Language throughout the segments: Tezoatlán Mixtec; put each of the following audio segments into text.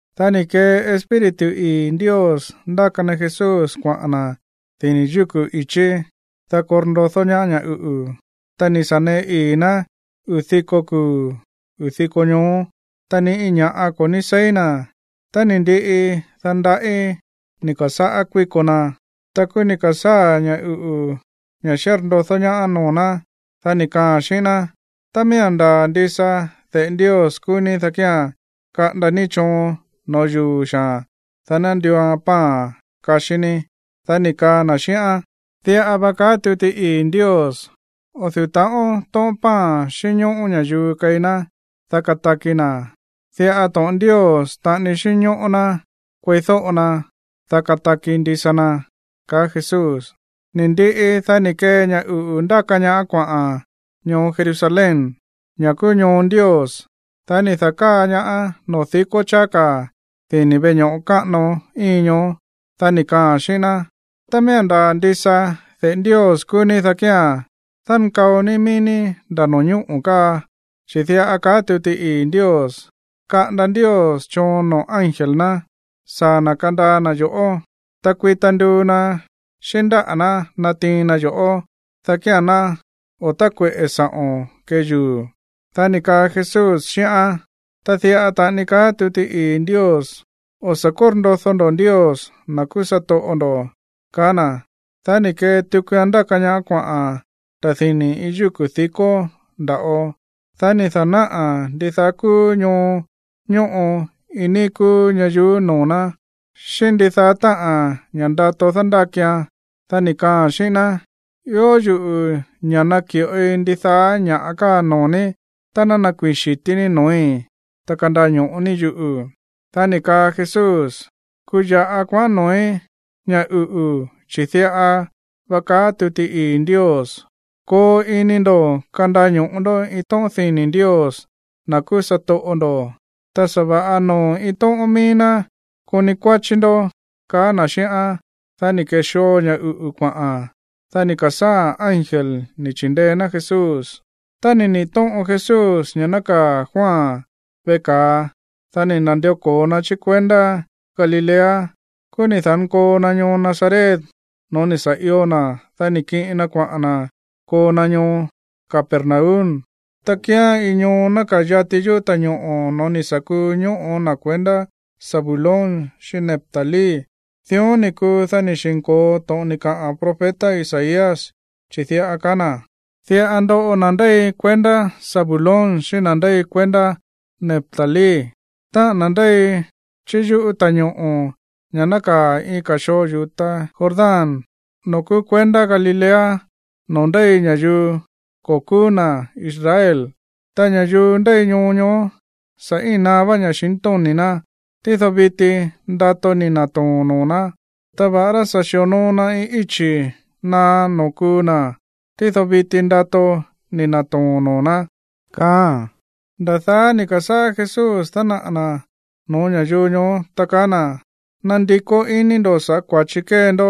Dá ni̱ kee Espíritu ii̱ Ndios ndáka na Jesús kuaꞌa̱n na̱ dini̱ yúku̱ i̱chí, dá korndodó ñaá ña̱ uꞌu̱. Ta ni̱ sa̱ neꞌe ii̱ ná uu̱ diko kuu̱, uu̱ diko ñoó, ta ni iin ña̱ꞌa ko̱ ní seí na̱. Ta ni̱ ndiꞌi, dá ndaꞌí ni̱ ka̱sáꞌá kuíko na. Ta kúú ni̱ ka̱sáa̱ ña̱ uꞌu̱, ña̱ xírndodó ñaá, noo̱ ná. Dá ni̱ kaaa̱n xíꞌín ná: ―Tá miía̱n ndaa̱ ndisa de̱ꞌe Ndios kúú ní, dá kía̱n kaꞌanda ní choon no̱ó yuu̱ xaa̱n, dá ná nduuan pan kaxí ní. Dá ni̱ kaa na̱ xíꞌán: ―Diꞌa va kaá tuti ii̱ Ndios: “O̱ du̱ú ta̱ꞌón tóꞌón pan xínñóꞌó ña̱yuu keí ná, dá kataki na̱. Diꞌa to̱ꞌon Ndios taꞌani xínñóꞌó ná kueídóꞌo na, dá kataki ndisa na” ―kaá Jesús. Ni̱ ndiꞌi, dá ni̱ kee ña̱ uꞌu̱ ndáka ñaáán kuaꞌa̱n ñoo Jerusalén, ña̱ kúú ñoo Ndios. Dá ni̱ da̱káa ñaáán noo̱ dikó cháá ka̱ dini̱ veꞌe ño̱ꞌo káꞌano íin ñoó. Dá ni̱ kaaa̱n xíꞌín ná: ―Tá miía̱n ndaa̱ ndisa de̱ꞌe Ndios kúú ní, dá kía̱n dánkao ní mií ní nda̱ no̱ñóꞌo̱ káa, chi̱ diꞌa kaá tuti ii̱ Ndios: Kaꞌanda Ndios choon noo̱ ángel ná saa̱ na̱ kandaa na̱ yo̱ꞌó. Ta kuita nduu na̱ xíꞌín ndáꞌa̱ ná natiin na yo̱ꞌó, dá kía̱n ná o̱ tákueꞌe̱ sa̱ꞌo̱n kee yuu̱. Dá ni̱ kaa Jesús xíꞌán: ―Ta diꞌa taꞌani kaá tuti ii̱ Ndios: “O̱ sa̱ kórndodó ndó Ndios, na̱ kúú satoꞌo ndo̱” ―kaá na̱. Dá ni̱ kee tukuan ndáka ñaáán kuaꞌa̱n nda̱ dini̱ iin yúku̱ dikó nda̱ꞌo. Dá ni̱ da̱náꞌa̱n ndidaá kúú ñoo ñóꞌo iin níí kúú ñayuú noo̱ ná, xíꞌín ndidaá táꞌa̱n ña̱ ndato dándákian. Dá ni̱ kaaa̱n xíꞌín ná: ―Ió yuꞌu̱ ña̱ naki̱ꞌoi ndidaá ña̱ káa noo̱ ní tá ná nakuii̱n xi̱tí ní no̱ói̱, ta kandaño̱ꞌo ní yuꞌu̱. Dá ni̱ kaa Jesús: ―Kuya̱ꞌa kuaꞌán noo̱í, ña̱ uꞌu̱, chi̱ diꞌa va kaá tuti ii̱ Ndios: “Koo ini ndo̱ kandaño̱ꞌo ndó iin tóꞌón dini̱ Ndios, na̱ kúú satoꞌo ndo̱, ta sa̱va̱ꞌa noo̱ iin tóꞌón míí ná koni kuáchí ndó” ―kaá na̱ xíꞌán. Dá ni̱ ke̱xoo ña̱ uꞌu̱ kuaꞌa̱n. Dá ni̱ ka̱sáa̱ ángel ni̱ chi̱ndeé ná Jesús. Tá ni̱ niꞌi̱ tóꞌon Jesús ña̱ nákaa̱ Juan veꞌe ka̱a, dá ni̱ na̱ndió ko̱o na chí kuendá Galilea. Kúú ni̱ da̱nkoo na ñoo Nazaret no̱ó ni̱ sa̱ io na̱. Dá ni̱ kiꞌin na kuaꞌa̱n na̱ koo na ñoo Capernaum, ta kíán iin ñoo nákaa̱ yati yúꞌu̱ ta̱ñoꞌo̱ no̱ó ni̱ sa̱ kuu ñóꞌo̱ na̱ kuendá Zabulón xíꞌín Neftalí. Dión ni̱ kuu, dá ni̱ xi̱nko̱o to̱ꞌon ni̱ kaꞌa̱n profeta Isaías, chi̱ diꞌa ni̱ kaa na̱: Diꞌa ndoꞌo na̱ ndéi kuendá Zabulón xíꞌín na̱ ndéi kuendá Neftalí, táꞌa̱n na̱ ndéi chí yúꞌu̱ ta̱ñoꞌo̱, ña̱ nákaa̱ iin ka̱ xoo yu̱ta Jordán, noo̱ kúú kuendá Galilea, noo̱ ndéi ña̱yuu ko̱ kúú na̱ Israel. Ta ña̱yuu ndéi ñoo ñoó, sa̱ íin naá ña̱xintóni̱ ná, tído viti ndato ni̱ na̱too̱n noo̱ ná. Ta va̱ꞌará sa̱ xi̱onoo na iin íchi̱ naá noo̱ kuu na̱, tído viti ndato ni̱ na̱too̱n noo̱ ná, kaáa̱n. Nda̱ daá ni̱ ka̱sáꞌá Jesús dánaꞌa̱ na̱ no̱ó ña̱yuu ñoó, ta kaá na̱: ―Nandikó iní ndo̱ sa̱ꞌá kua̱chi kée ndó,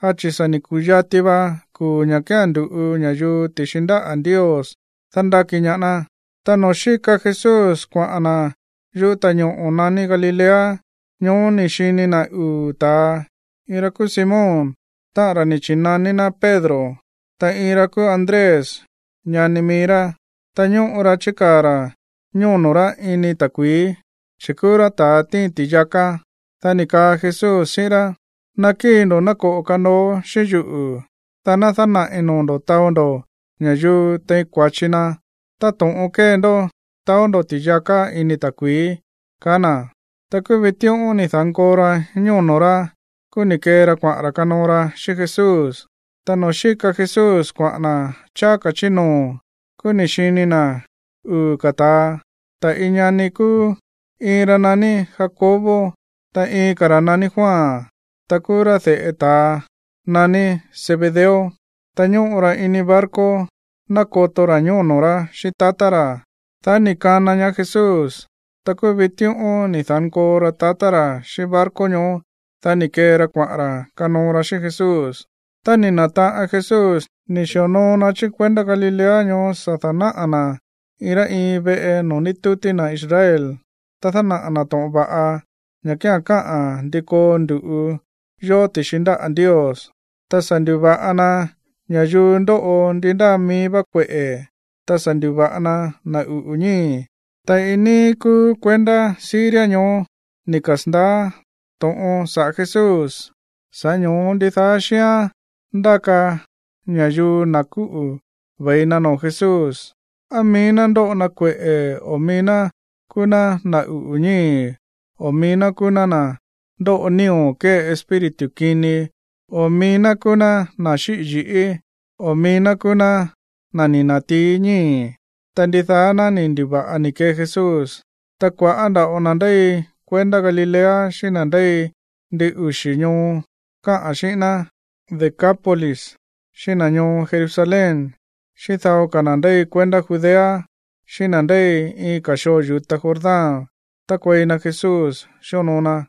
dá chi̱ sa̱ ni̱ ku̱yati va kuu̱ ña̱ kía̱n ndu̱ꞌu ña̱yuu ti̱xi ndáꞌa̱ Ndios dándáki ñaá ná. Ta noo̱ xíka Jesús kuaꞌa̱n na̱ yúꞌu̱ ta̱ñoꞌo̱ naní Galilea, ñoó ni̱ xini na̱ uu̱ ta̱a, iin ra kúú Simón, táꞌa̱n ra̱ ni̱ chi̱naní ná Pedro, ta iin ra̱ kúú Andrés, ñani mií rá. Ta ñóꞌo ra chíkaa̱ ra̱ ñóno̱ rá ini ta̱kui̱í, chi̱ kúú rá ta̱ tíin ti̱yaká. Dá ni̱ kaa Jesús xíꞌín rá: ―Nakíi̱ ndo̱ ná koꞌo̱ kanooó xíꞌín yuꞌu̱, dá ná dánaꞌi̱ noo̱ ndo̱ taó ndo̱ ña̱yuu tein kua̱chi na táto̱ꞌon kée ndó taó ndo̱ ti̱yaká ini ta̱kui̱í ―kaá na̱. Ta kúú vitíꞌón ni̱ da̱nkoo ra ñóno̱ rá. Kúú ni̱ kee ra kuaꞌa̱n ra̱ kanoo ra xíꞌín Jesús. Ta noo̱ xíka Jesús kuaꞌa̱n na̱ cháá ka̱ chí noo̱, kúú ni̱ xini na̱ uu̱ ka̱ ta̱a, ta̱ iin ñani kúú, iin ra̱ naní Jacobo, ta iin ka̱ ra̱ naní Juan. Ta kúú rá de̱ꞌe ta̱a naní Zebedeo. Ta ñóꞌo ra ini barco nákoto ra̱ ñóno̱ rá xíꞌín tatá ra̱. Dá ni̱ kana ñaá Jesús. Ta kúú vitíꞌón ni̱ da̱nkoo ra tatá ra̱ xíꞌín barco ñoó. Dá ni̱ kee ra kuaꞌa̱n ra̱ kanoo ra xíꞌín Jesús. Ta ni̱ na̱taꞌan Jesús ni̱ xi̱onoo na chí kuendá Galilea ñoó sa̱ da̱náꞌa̱ na̱ iin rá iin veꞌe noo̱ ndítútí na̱ Israel. Ta dánaꞌa̱ na̱ to̱ꞌon va̱ꞌa, ña̱ kía̱n káꞌa̱n ndi koo ndu̱ꞌu yó ti̱xi ndáꞌa̱ Ndios. Ta sa̱ ndu̱va̱ꞌa na ña̱yuu ndóꞌo ndi ndáa mií vá kueꞌe̱, ta sa̱ ndu̱va̱ꞌa na na̱ uꞌu̱ ñíi̱. Ta iin níí kúú kuendá Siria ñoó ni̱ kasa̱ndaá to̱ꞌon saꞌa̱ Jesús, sa̱ꞌá ño̱ó ndidaá xíán ndáka ña̱yuu na̱ kúꞌu̱ ve̱i na noo̱ Jesús, á mií ná ndóꞌo na kueꞌe̱, o mií ná kúú ná na̱ uꞌu̱ ñíi̱, o mií ná kúú ná na̱ ndóꞌo nío̱ kée espíritu kini, o mií ná kúú ná na̱ xíꞌi̱ yi̱ꞌí, o mií ná kúú ná na̱ ni̱ na̱tií ñíi̱. Ta ndidaá ná ni̱ ndu̱va̱ꞌa ni̱ kee Jesús. Ta kua̱ꞌá nda̱ꞌo na̱ ndéi kuendá Galilea, xíꞌín na̱ ndéi ndin uxi̱ ñoo káꞌa̱n xíꞌín ná Decápolis, xíꞌín na̱ ñoo Jerusalén, xíꞌín dao ka̱ na̱ ndéi kuendá Judea, xíꞌín na̱ ndéi iin ka̱ xoo yu̱ta Jordán tákuei na Jesús xíonoo na.